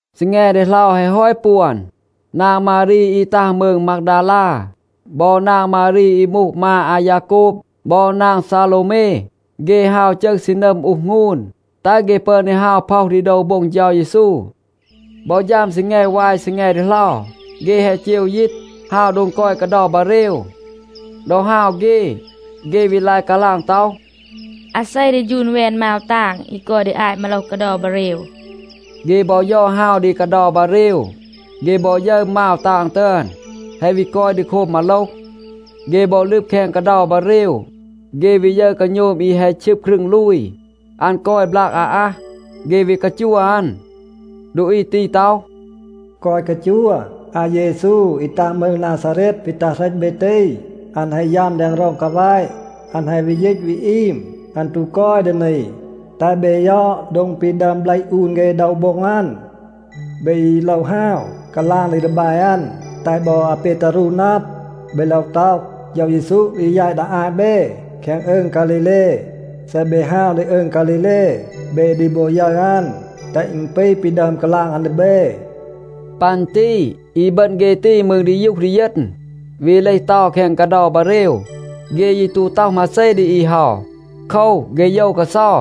ซีแง ดีเหลา แฮะ ฮอต ปวน, นาง มารี อี ตัห มืง มากดาลา บอ นาง มารี อี มูห มา อายาโกบ บอ นาง ซาโลวเม, เฆ ฮาว จึห ซีนัม อูห หงูน, แตห เฆ ปึอน ดี ฮาว พ็อห ดี โดว โบ็ง เฌา เยซู. บอ ฌัม ซีแง วาย ซีแง ดีเหลา, เฆ แฮะ เจว ยีต, ฮาว โดง กอย กาเดา บาเรว. ดอ ฮาว เฆ, เฆ วี ลาย กาลาง ต็อห, “อาเซ ดี ฌูน แวน มาว ตาง อี กอย ดี อาต มาโลห กาเดา บาเรว?” เฆ บอ ยอด ฮาว ดี กาเดา บาเรว, เฆ บอ ยึร มาว ตาง ตึอน แฮะ วี กอย ดี โคบ มาโลห. เฆ บอ ลึบ แคง กาเดา บาเรว, เฆ วี ยึร กาโณม อี แฮะ ชึบ ครึง ลูย. อัน กอย บลาก อาอัห. เฆ วี กาจัว อัน. ดูอี ตี ต็อห, “แกวะ กาจัว, อาเยซู อี ตัห มืง นาซาเรต ปี ตัห เหรต เบ ตี, อัน แฮะ ยัม แดง ร็อง กาแวะ. อัน แฮะ วี ยีต วี อีม. อัน ตู กอย ดี นี. แตห เบ ยอด โดง ปี ดึอม เบลห อูน เฆ โดว โบ็ง อัน. เบ ยี โลว ฮาว, กาลาง ดี ดีแบ อัน, แตห บอ อาเปตารู นับ. เบ โลว ต็อห, ‘เฌา เยซู ดี แยต ดี อาต เบ แคง อืง ฆาลีเล. เซ เบ ฮาว ดี อืง ฆาลีเล, เบ ดี บอ ยึร อัน, แตห อึณ ปี ปี ดึอม กาลาง อัน ดี เบ.’” ปัน ตี อีบึณ เฆ ตี มืร ดียูห ดีเยณ, วี เลห เตา แคง กาเดา บาเรว. เฆ ยี ตู ต็อห มาเซ ดี อี เฮา. โคว, เฆ โยว กาเซา.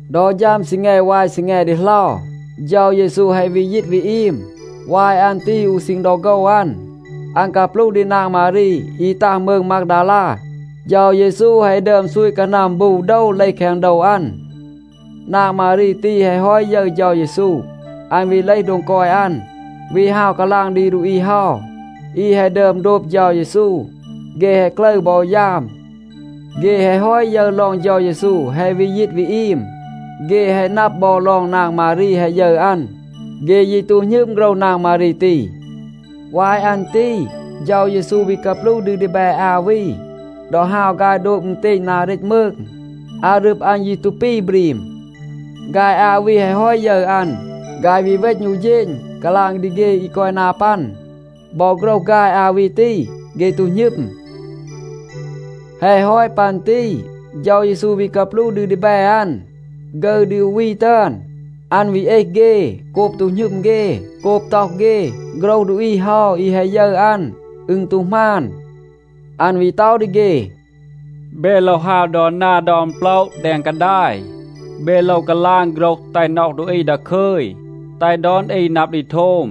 ดอ ฌัม ซีแง วาย ซีแง ดีเหลา, เฌา เยซู แฮะ วี ยีต วี อีม. วาย อัน ตี อู ซีณ ดอ โฆว อัน, อัน กาปลูห ดี นาง มารี อี ตัห มืง มากดาลา. เฌา เยซู แฮะ ดึอม ซูต กานัม บู โดว เลห แคง โดว อัน. นาง มารี ตี แฮะ ฮอต ยึร เฌา เยซู, อัน วี เลห โดง กอย อัน, วี ฮาว กาลาง ดี ดูอี เฮา, อี แฮะ ดึอม โดบ เฌา เยซู. เฆ แฮะ กลึร บอ ยาม. เฆ แฮะ ฮอต ยึร ลอง เฌา เยซู แฮะ วี ยีต วี อีม, เฆ แฮะ นับ บอ ลอง นาง มารี แฮะ ยึร อัน, เฆ ยี ตู หณึม โฆรห นาง มารี ตี. วาย อัน ตี เฌา เยซู วี กาปลูห ดี ดีแบ อา วี ดอ ฮาว ฆาย โดบ อึณเตณ นา เรต มืง. อารึบ อัน ยี ตู ปี บรีม. ฆาย อา วี แฮะ ฮอต ยึร อัน, ฆาย วี เวณ อู เฌณ กาลาง ดี เฆ อี กอย นา ปัน. บอ โฆรห ฆาย อา วี ตี, เฆ ตู หณึม. แฮะ ฮอต ปัน ตี เฌา เยซู วี กาปลูห ดี ดีแบ อัน ฆึร ดี อู วี ตึอน. อัน วี เอห เฆ โกบ ตู หณึม เฆ, โกบ ต็อห เฆ, โฆรห ดูอี เฮา อี แฮะ ยึร อัน, อึณ ตู หมาน. อัน วี ต็อห ดี เฆ, “เบ โลว ฮาว ดอน นา ดอน โปละ แดง กาดาย. เบ โลว กาลาง โฆรห แตห น็อห ดูอี ดาคึย, แตห ดอน อี นับ ดี โทม.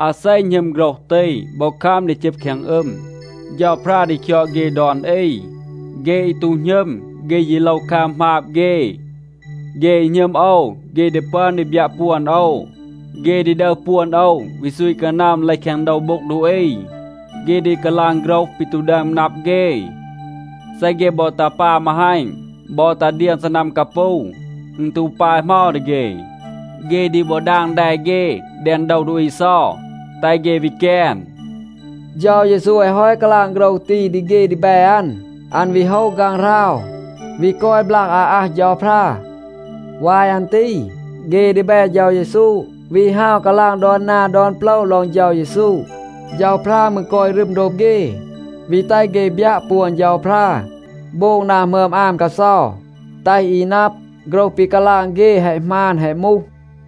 อาเซ หณึม โฆรห ตี บอ คัม ดี จึบ แคง อึม, เฌาพรา ดี คยอด เฆ ดอน อี. เฆ อี ตู หณึม, เฆ ยี โลว คัม หมาบ เฆ. เฆ อี หณึม โอว, เฆ ดี ปึอน ดี บยัะ ปวน โอว. เฆ ดี ดึห ปวน โอว วี ซูต กานัม เลห แคง โดว โบ็ง ดูอี. เฆ ดี กาลาง โฆรห ปี ตู ดึอม นับ เฆ. เซ เฆ บอ ตา ปา มาฮัณ บอ ตา เดียง ซีนัม กาปู, อึณ ตู ปาย เหมา ดี เฆ. เฆ ดี บอ ดาง แด เฆ แดง โดว ดูอี เซา, แตห เฆ วี แกน.” เฌา เยซู แฮะ ฮอต กาลาง โฆรห ตี ดี เฆ ดีแบ อัน, อัน วี โฮะ ฆางหราว, วี กอย บลาก อาอัห เฌาพรา. วาย อัน ตี เฆ ดีแบ เฌา เยซู วี ฮาว กาลาง ดอน นา ดอน โปละ ลอง เฌา เยซู. เฌาพรา มืร กอย รึม โดบ เฆ, วี แตห เฆ บยัะ ปวน เฌาพรา, โบง นา หมึอม อาม กาเซา, แตห อี นับ, โฆรห ปี กาลาง เฆ แฮะ หมาน แฮะ มูห.a